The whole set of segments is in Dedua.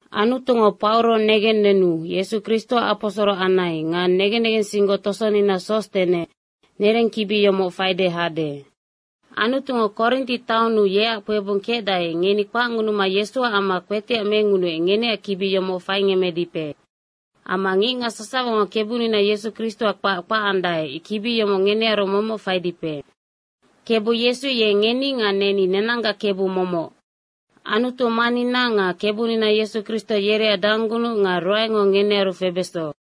Anutungo Pauro negennenu Yesu Kristoac aposoro anai nga negen negensinggoc tosonina Sostene, nereng kibi yomoc faide hade. Anutungo Korinti taonnu yeac kpebung kecdae, ngeni kpacngunuma Yesuac amma kpetiac mengunuec, ngeneac kibi yomoc faingemmedipe. Amma ngicngac sasawango Kebunina Yesu Kristoac kpac kpacandae, kibi yomoc ngenearu momoc faidipe. Kebu Yesu ye ngeni nga neni, nenanggac Kebu momoc. Anutu Mannina nga Kebunina Yesu Kristo yereac danggunuc nga ruaengo ngenearu febeso.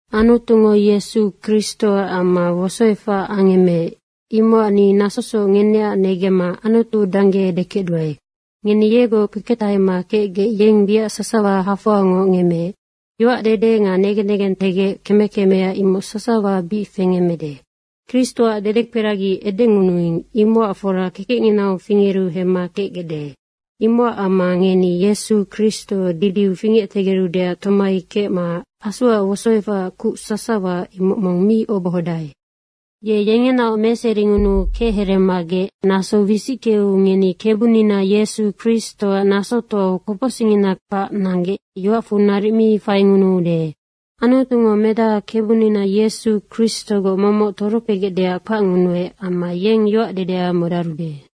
Anutungo Yesu Kristoac amma wosoefac angemmeec, imocac ni nasosoc ngeneac negemma Anutu dangge edekecduae. Ngeni yegoc kpeketahema kecgec yeng wiac sasawa hafoangoc ngemmeec. Yoacdede nga negen negentegec keme kemea imoc sasawa bic fengemmede. Kristoac dedekperagi edengunuing, imocac fora kekecnginau fingeru hemma kecgecde. Imocac amma ngeni Yesu Kristo didiu fingectegerudeac tomai kecma Asuac wosoefacac kuc sasawa, imocac mong mi obohodae. Ye yengenaoc meseringunuu kechereemagec naso wisickeu ngeni Kebunina Yesu Kristoac nasotoau kopocsicngina kpac nanggec yoacfu naric mi faingunuude. Anutungo Medaha Kebunina Yesu Kristogoc momoc torokpegecdeac kpacngunuec amma yeng yoacdedea modarude.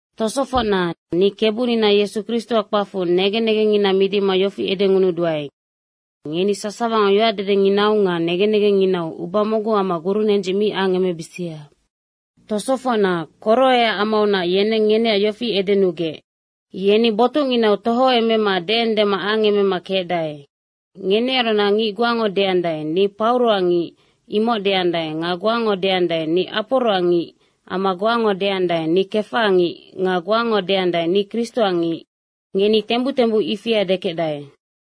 Tosofocna, ni Kebunina Yesu Kristoac kpacfu negen negengngina midima yofi edengunuduae, ngeni sasawango yoacdedenginau nga negen negengnginau uba mocgu amma gurunendzic mi angemebisia. Tosofocna, Koroeac amaunac yeneng ngeneac yofi edenugec, “Yeni botucnginau tohoemema deendema angemema kecdae.” Ngenearunac ngic goango deandae, “Ni Pauroac ngic.” imoc deandae. Nga goango deandae, “Ni Aporoac ngic.” amma goango deandae, “Ni Kefaac ngic.” nga goango deandae, “Ni Kristoac ngic.” ngeni tembuc tembuc ifia dekecdae.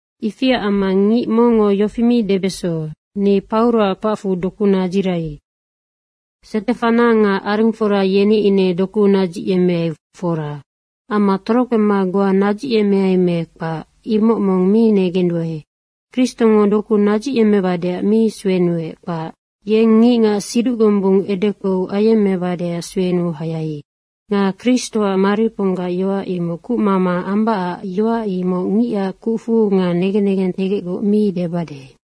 Ifiac amma ngic mongngo yofi mi debeso, “Ni Pauroac kpacfu doku nadzirai.” Stefana nga arengfora yeni ine doku nadzicyemmeai, fora. Amma torokpema goa nadzicyemmeai me kpac, imoc mong mi negenduae. Kristongo doku nadzicyemmebadeac mi suenuec, kpac. Yeng ngicngac siduc gombung edekpou angemmebadeac suenuu hayai. Nga Kristoac mariponggac yoac imoc kucmama ambacac yoac imoc ngicac kucfu nga negen negentegecgoc mi debade.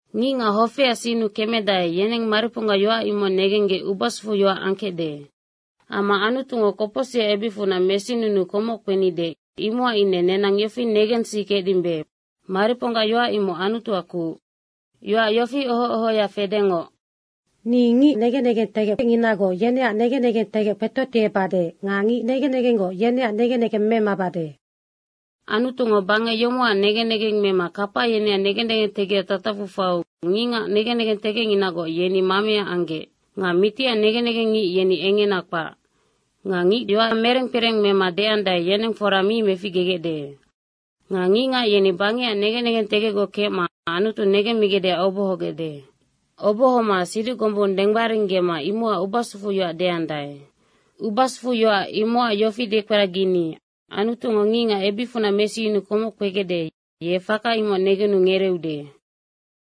Ngicngac hofeac sinnu kemedae, yeneng mariponggac yoac imoc negenggec ubasufu yoac angkecde. Amma Anutungo kopocsicac ebicfunac mesinunuu komoc kpenide, imocac ine nenang yofi negensikecdimbe, mariponggac yoac imoc Anutuac kuc. Yoac yofi oho ohoya fedengoc, “Ni ngic negen negentegecnginagoc yeneac negen negentegec kpetotiebade nga ngic negen negenggoc yeneac negen negeng memabade.” Anutungo bangec yomocac negen negeng mema kapa yeneac negen negentegecac tatacfu faiu ngicngac negen negentegecnginagoc, yeni mamea anggec. Nga mitiac negen negengngic yeni engena kpac. Nga ngic yoac mereng kpereng mema deandae, yeneng fora mong mi meficgegecde. Nga ngicngac yeni bangecac negen negentegecgoc kecma Anutu negemmigecdeac obohogecde. Obohoma siduc gombung denggbaringgema imocac ubasufuyoac deandae. Ubasufuyoac imocac yofi dekperagini Anutungo ngicngac ebicfunac mesiyunuu komoc kpegecde, ye faka imoc negenu ngereeude.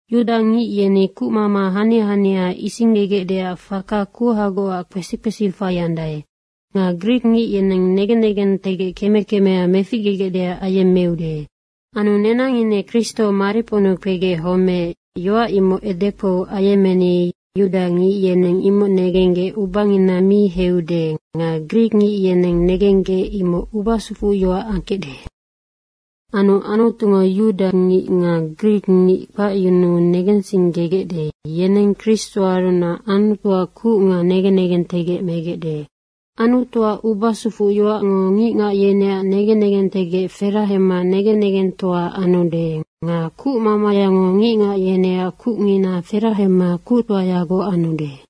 Yudangic yeni kuc hania hania isinggegecdeac faka kuhagocac kpesi kpesi faiandae. Nga grikngic yeneng negen negentegec keme kemea meficgegecdeac ayemmeude. Anu nenang ine Kristo mariponnu kpegec homeec, yoac imoc edekpou ayemmeni, yudangic yeneng imoc negenggec ubangina mi heiude nga grikngic yeneng negenggec imoc ubasufuyoac angkecde. Anu Anutungo yudangic nga grikngic kpacyunuu negensinggegecde, yeneng Kristoarunac Anutuac kuc nga negen negentegec megecde. Anutuac ubasufuyoacngo ngicngac yeneac negen negentegec ferahema negen negengtoa anude nga kucmamayango ngicngac yeneac kucngina ferahema kuctoayagoc anude.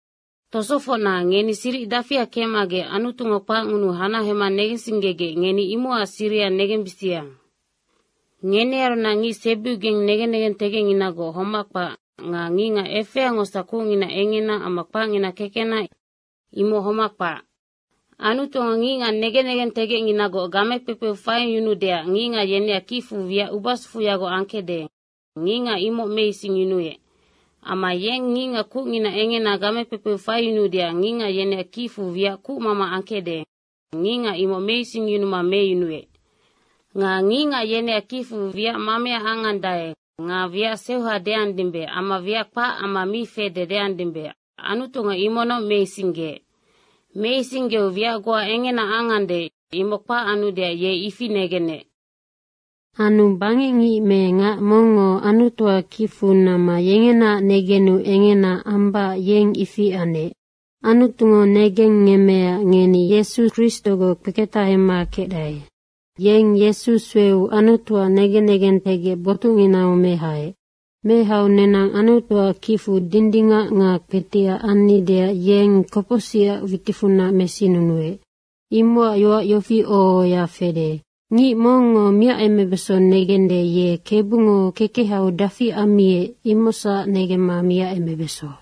Tosofocna, ngeni siric dafia kecmagec, Anutungo kpacngunuu hanahema negensinggegec, ngeni imocac siriha negensibisia. Ngenearunac ngic sebiubigeng negen negentegecnginagoc homac kpac nga ngicngac efeangosac kucngina engena amma kpacngina kekena, imoc homac kpac. Anutungo ngicngac negen negentegecnginagoc game kpekpeu faiyunuudeac ngicngac yeneac kicfu wiac ubasufuyagoc angkecde, ngicngac imoc meisingyunuec. Amma yeng ngicngac kucngina engena game kpekpeu faiyunuudeac ngicngac yeneac kicfu wiac kucmama angkecde, ngicngac imoc meisingyunuma meyunuec. Nga ngicngac yeneac kicfu wiac mamea angande nga wiac seuha deandimbe amma wiac kpac amma mi fede deandimbe, Anutungo imocnoc meisinggeec. Meisinggeu wiac goa engena angande imoc kpac anudeac ye ifi negenec. Anu bangecngic me ngac mongngo Anutuac kicfu namma yengenaac negenu engena ambacac, yeng ifi anec. Anutungo negengngemmeecac ngeni Yesu Kristogoc kpeketahema kecdae. Yeng Yesu sueu Anutuac negen negentegec botucninau mehaec. Mehau nenang Anutuac kicfu dindingac nga kpetiac annideac yeng kopocsicac witicfunac mesinunuec. Imocac yoac yofi oho ohoya fede, “Ngic mongngo miacemebeso negende, ye Kebungo kekehau dafi ammiec, imocsac negemma miacemebeso.”